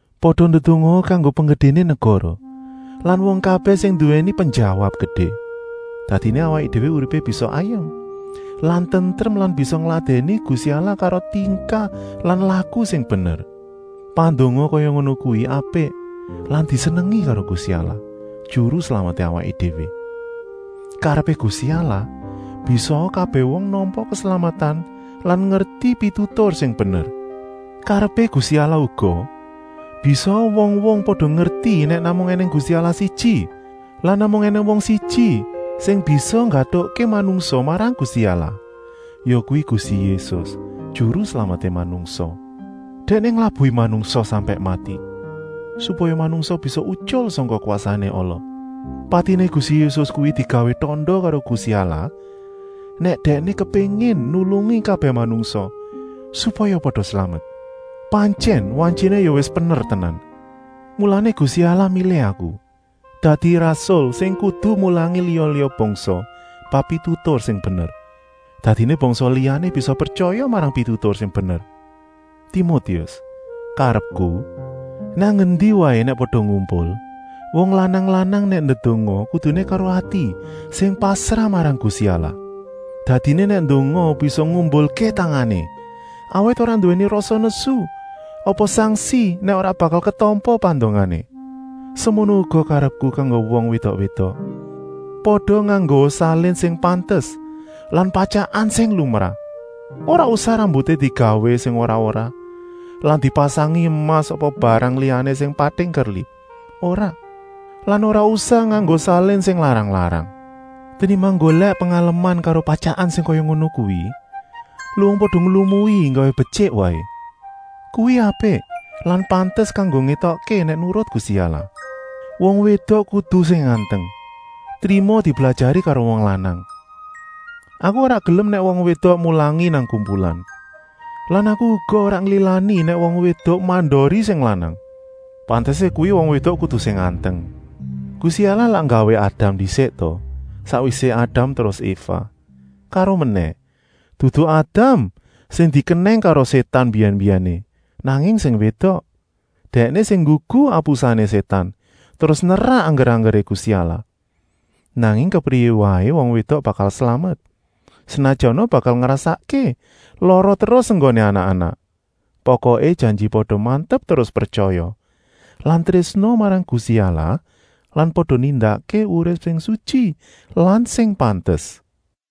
Pada ndedongaa kanggo penggedéné negara lan wong kabèh sing nduwèni penjawab gedé. Dadiné awaké déwé uripé bisa ayem lan tentrem lan bisa ngladèni Gusti Allah karo tingkah lan laku sing bener. Pandonga kaya ngono kuwi apik lan disenengi karo Gusti Allah, Juru Slameté awaké déwé. Karepé Gusti Allah, bisaa kabèh wong nampa keslametan lan ngerti pitutur sing bener. Karepé Gusti Allah uga, bisaa wong-wong pada ngerti nèk namung ènèng Gusti Allah siji lan namung ènèng wong siji sing bisa nggatukké manungsa marang Gusti Allah, yakuwi Gusti Yésus, Juru Slameté manungsa. Dèkné nglabuhi manungsa sampèk mati, supaya manungsa bisa utyul sangka kwasané ala. Patiné Gusti Yésus kuwi digawé tanda karo Gusti Allah nèk Dèkné kepéngin nulungi kabèh manungsa, supaya pada slamet. Pantyèn wantyiné ya wis pener tenan. Mulané Gusti Allah milih aku dadi rasul sing kudu mulangi liya-liya bangsa bab pitutur sing bener. Dadiné bangsa liyané bisa pretyaya marang pitutur sing bener. Timotius, karepku, nang endi waé nèk pada ngumpul, wong lanang-lanang nèk ndedonga kuduné karo ati sing pasrah marang Gusti Allah. Dadiné nèk ndonga bisa ngumbulké tangané, awit ora nduwèni rasa nesu apa sangsi nèk ora bakal ketampa pandongané. Semono uga karepku kanggo wong wédok-wédok, pada nganggoa salin sing pantes lan patyakan sing lumrah. Ora usah rambuté digawé sing ora-ora lan dipasangi emas apa barang liyané sing pating kerlip, ora. Lan ora usah nganggo salin sing larang-larang. Tenimbang nggolèk pengaleman karo patyakan sing kaya ngono kuwi, luwung pada nglumui nggawé betyik waé. Kuwi apik lan pantes kanggo ngétokké nèk nurut Gusti Allah. Wong wédok kudu sing anteng, trima diblajari karo wong lanang. Aku ora gelem nèk wong wédok mulangi nang kumpulan. Lan aku uga ora nglilani nèk wong wédok mandori sing lanang. Pantesé kuwi wong wédok kudu sing anteng. Gusti Allah lak nggawé Adam ndisik ta, sakwisé Adam terus Eva. Karomenèh, dudu Adam sing dikenèng karo Sétan mbiyèn-mbiyèné, nanging sing wédok. Dèkné sing nggugu apusané Sétan terus nerak angger-anggeré Gusti Allah. Nanging kepriyé waé wong wédok bakal slamet, senajana bakal ngrasakké lara terus enggoné anak-anak, pokoké janji pada mantep terus pretyaya lan trésna marang Gusti Allah lan pada nindakké urip sing sutyi lan sing pantes.